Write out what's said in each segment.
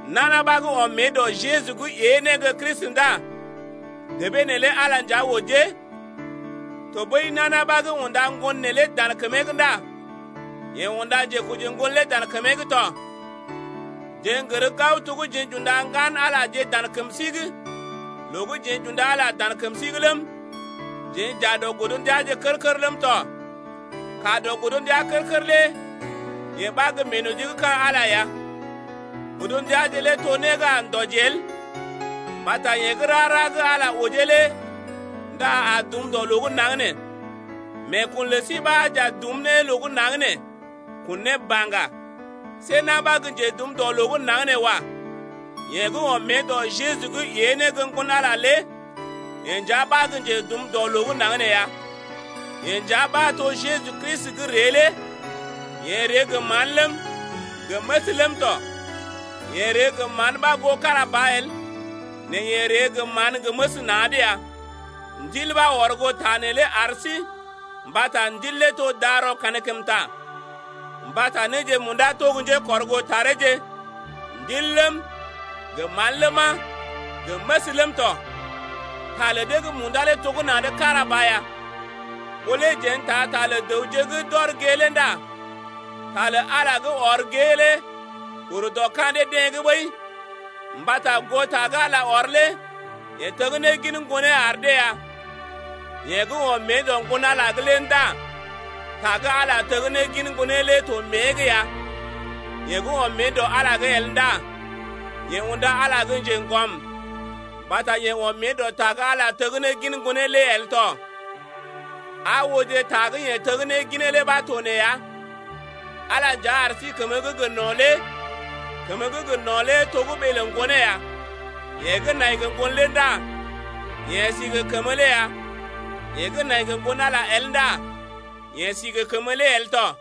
Nana ɓa gə́ ɔm mée dɔ Jeju’g ée ne gə́ Kristi ndá debee neelé Ala nja ojee. Tɔɓəi nana ɓa gə́ unda ŋgon neelé dan kəmee’g ndá yeḛ unda njekoji ŋgon lé dan kəmee’g tɔ. Jeḛ n’gər gao to gə́ jeḛ j’unda ŋgan-Alaje dan kəm sí’g loo gə́ jeḛ j’unda Ala dan kəm sí’g ləm. Jeḛ j’aa dɔ godndiaje kər-kər ləm tɔ Kaa dɔ godndia kər-kər lé yee ɓa gə́ meenoji gə́ ka̰ Ala ya. Godndiaje lé to né gə́ a ndɔji el mbata yeḛ gə́ rara gə́ Ala ojee lé ndá a dum dɔ loo gə́ naŋg nee, meekun lə sí ɓa j’a dum ne loo gə́ naŋg nee, kun ne baŋga. See na̰ ɓa gə́ njedum dɔ loo gə́ naŋg nee wa. Yeḛ gə́ ɔm mée dɔ Jeju’g ée ne gə́ Ŋgon-Ala lé yeḛ nja ɓa gə́ njedum dɔ loo gə́ naŋg nee ya. Yeḛ nja ɓa to Jeju Kristi gə́ ree lé, yeḛ ree gə mán ləm, gə məs ləm tɔ. Yeḛ ree gə mán ɓa goo kára ba el, nɛ yeḛ ree gə mán gə məs na̰’d ya. Ndil ɓa ɔr goo ta neelé ar sí mbata Ndil lé to darɔ kankəmta. Mbata néje munda to gə́ njékɔrgoo tareeje: Ndil ləm, gə mán ləma, gə məs ləm tɔ. Ta lə dee gə́ munda lé to gə́ na̰’d kára ɓa ya. Ɓó lé jeḛ n’taa ta lə dəwje gə́ d’ɔr gée lé ndá ta lə Ala gə́ ɔr gée lé ur dɔ ka̰ dee-deḛ’g ɓəi, mbata goo ta gə́ Ala ɔr lé yeḛ teg ne gin Ŋgonee ar dee ya. Yeḛ gə́ ɔm mée dɔ Ŋgon-Ala’g ndá ta gə́ Ala teg ne gin Ŋgonee lé to mée’g ya. Yeḛ gə́ ɔm mée dɔ Ala’g el ndá yeḛ unda Ala gə́ njeŋgɔm mbata yeḛ ɔm mée dɔ ta gə́ Ala teggin Ŋgonee lé el tɔ. Aa ooje, ta gə́ yeḛ tegginee lé ɓa to nee ya: Ala nja ar sí kəmə gə́ gə no̰ lé. Kəmə gə́ gə no̰ lé to gə́ ɓee lə Ŋgonee ya. Yeḛ gə́ nai gə Ŋgon lé ndá yeḛ si gə kəmə lé ya. Yeḛ gə́ nai gə Ŋgon-Ala el ndá yeḛ si gə kəmə lé el tɔ.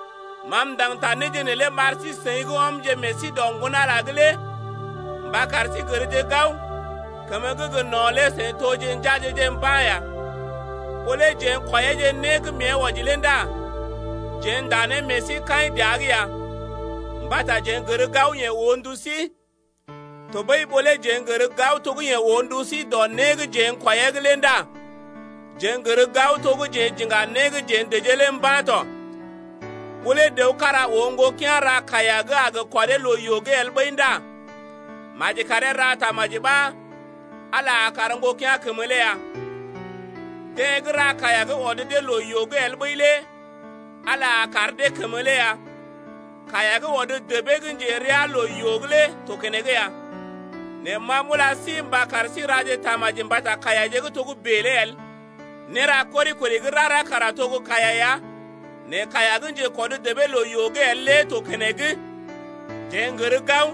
Ma m’ndaŋg ta néje neelé m’ar sí-seḭ gə́ ɔmje meḛ sí dɔ Ŋgon-Ala’g mba kar sí gərje gao, kəmə gə́ gə no̰ lé seḭ toje njeaje-je mba̰ ya. Ɓó lé jeḛ n’kwɔiyeeje né gə́ mée wɔji lé ndá jeḛ ndá ne meḛ sí kaḭ dəa’g ya mbata jeḛ n’gər gao yeḛ oo ndu sí. Tɔɓəi ɓó lé jeḛ n’gər gao to gə́ yeḛ oo ndu sí dɔ né gə́ jeḛ n’kwɔiyee’g lé ndá jeḛ n’gər gao to gə́ jeḛ j’iŋga né gə́ jeḛ dəjee lé mba̰ tɔ. Ɓó lé dəw kára oo ŋgokea̰ ra kaiya gə́ a gə kɔdee loo-yoo’g el ɓəi ndá maji karee ra tamaji ɓa Ala a kar ŋgokea̰ kəmə lé ya. Deḛ gə́ ra kaiya gə́ ɔd dee loo-yoo’g el ɓəi lé Ala a kar dee kəmə lé ya. Kaiya gə́ ɔd debee gə́ njerea loo-yoo’g lé to keneŋ ya, nɛ ma m’ula sí mba kar sí raje tamaji mbata kaiyaje gə́ togə́bè lé el. Néra kori-kori gə́ rara kara to gə́ kaiya ya, nɛ kaiya gə́ njekɔd debee loo-yoo’g el lé to keneŋ. Jeḛ n’gər gao,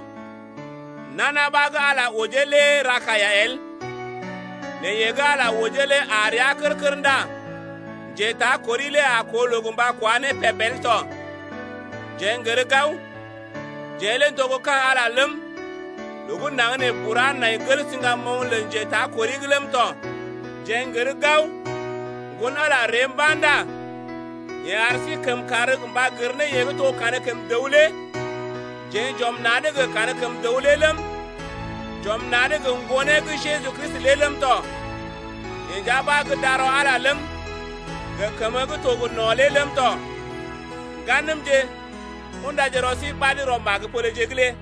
nana ɓa gə́ Ala ojee lé ra kaiya el, nɛ yeḛ gə́ Ala ojee lé aa rəa kər-kər ndá njetakori lé a koo loo gə mba kwá ne peb el tɔ. Jeḛ n’gər gao, jeḛ lé n’to gə́ ka̰ Ala ləm, loo gə́ naŋg nee bura nai gel siŋgamoŋ lə njetakori’g ləm tɔ. Jeḛ n’gər gao, Ŋgon-Ala ree mba̰ ndá yeḛ ar sí kəmkàr gə mba gər ne yeḛ gə́ to gə́ Kankəm dəw lé. Jeḛ j’ɔm na̰’d gə Kankəm dəw lé ləm, j’ɔm na̰’d gə Ŋgonee gə́ Jeju Kristi lé ləm tɔ. Yeḛ nja ɓa gə́ darɔ Ala ləm, gə kəmə gə́ to gə no̰ lé ləm tɔ. Ŋganəmje, undaje rɔ sí ɓad rɔ magə-poleje’g lé.